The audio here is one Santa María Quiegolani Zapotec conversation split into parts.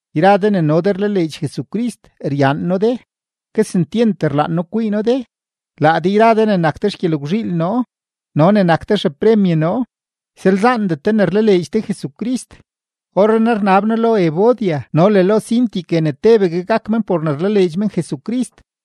Yra de ne no de rlaleedx Jesucrist, ryaan noo de, kesentyent rlaan noo kwii noo de, laa de yra de ne nak de xgyelgwzhiil noo no ne nak de xepremye noo; ysalzaandet de ne rlaleedx de Jesucrist. Orrenaa rnab noo lo Evodia no le lo Síntique ne tebegue gak men por ne rlaleedx men Jesucrist.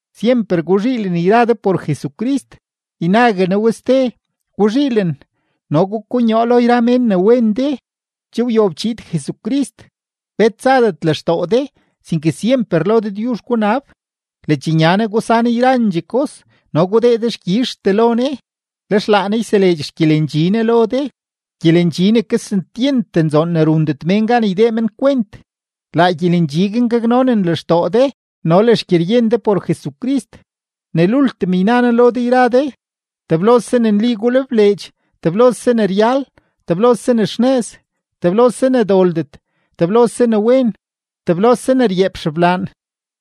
Syemper guzhiilen yra de por Jesucrist. Ynague noo we ste: ¡Guzhiilen! No gukonyoo lo yra mén ne wen de. Che wyob chiid Jesucrist. Bet tsadet lextoo de, sinke syemper lo Dëdyuzh gunab, ledxnya Ne gusan yrandxee kos no gudee dexkyizhtee lo Ne. Lex laa Ne yseleedx xgyelendxi Ne lo de, gyelendxi ne kesentyent nzoon ne rundet mén gan ydee men kwent; laa gyelendxi guin gaknonen lextoo de no le xgyeryen de por Jesucrist. Ne lultim yna noo lo de yra de, teblose ne nli gulebleedx, teblose ne ryal, teblose ne xnëz, teblose ne doldet, teblose ne wen, teblose ne ryeep xeblaan;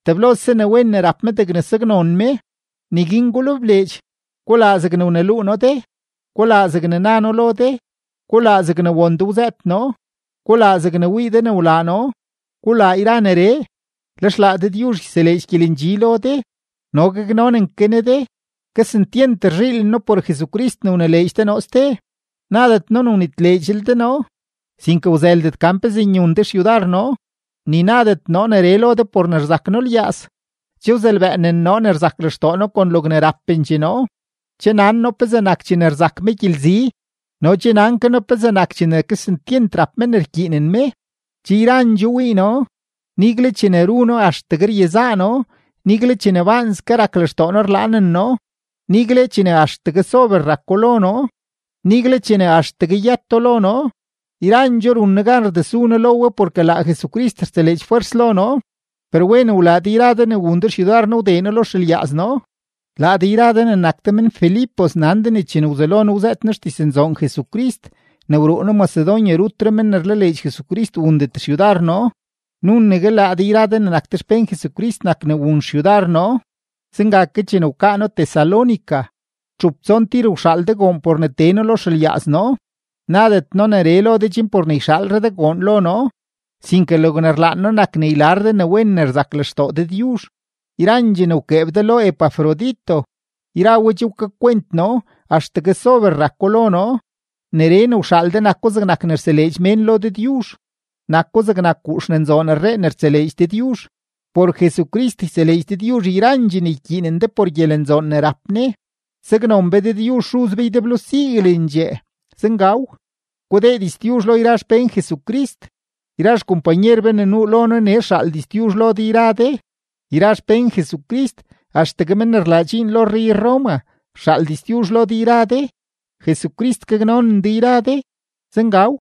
teblose ne wen ne rap me degne saknon me, neguin gulebleedx. Gulaa zegne wneluu noo de, gulaa zegne na noo lo de, gulaa zegne won de wzëët noo, gulaa zegne wii de ne wlaa noo. Gulaa yra neree, lex laa Dëdyuzh yseleedx gyelendxi lo de no gaknonen ke Ne de. Kesentyent rzhiilen noo por Jesucrist ne wnileedx de noo ste. Nadet noo ne wnitleedxlel de noo, sinke wzëldet gan pezee nyun de xyudar noo. Ni nadet noo neree lo de por ne rzak noo lyaaz. Che wzelbëënen noo ne rzak lextoo noo kon logne rapendxee noo. Che nan noo pezee nak chene rzak me gyelzi no nan ke noo pezee nak chene kesentyent rap me ne rkyiinen me. Che yrandxoo wii noo, nigle chene ru noo axtegue ryezaa noo, nigle chene baanske rak lextoo noo rlaanen noo, nigle chene axtegue sober rako lo noo, nigle chene axtegue yëto lo noo. Yrandxoo run noo gan rdesu noo lo we porke laa Jesucrist rseleedx fwers lo noo. Per wen wlaa de yra de ne wun de xyudar noo wdee noo lo xelyaaz noo. Laa de yra de ne nak de men-Filipos nan de ne chene wzelo noo wzëët noo xdiznzoon Jesucrist chene wruu noo Macedonia, rutre men ne rlaleedx Jesucrist wundet xyudar noo, nunegue laa de yra de ne nak de xpén Jesucrist nak ne wun xyudar noo. Zenga ke chene wkaa noo Tesalónica, txup tson tir wxaal de goon por ne tee noo lo xelyaaz noo. Nadet noo neree lo de chen por ne yxaalre de goon lo noo, sinke logne rlaan noo nak ne ylar de ne wen ne rzak lextoo Dëdyuzh. Yrandxee ne wkeeb de lo Epafrodito, yra we che wkakwent noo axtegue sober rako lo noo; neree ne wxaal de nako zegnak ne rseleedx mén lo Dëdyuzh, nako zegnak guux ne nzoon rree ne rtseleedx Dëdyuzh. Por Jesucrist yseleedx Dëdyuzh yrandxee ne ykyiinen de por gyelenzaknzoon ne rap Ne. Saknon be Dëdyuzh Xuz be ydeblo siguelendxee. Zengaw. Gudee diztyuzh lo yra xpén Jesucrist. Yra xkompanyer be ne nuu lo noo nee rxaal diztyuzh lo de yra de. Yra xpén Jesucrist, axtegue men ne rlaa dxiin ruxyuu rrey-Roma, rxaal diztyuzh lo de yra de. Jesucrist gaknonen de yra de. Zengaw.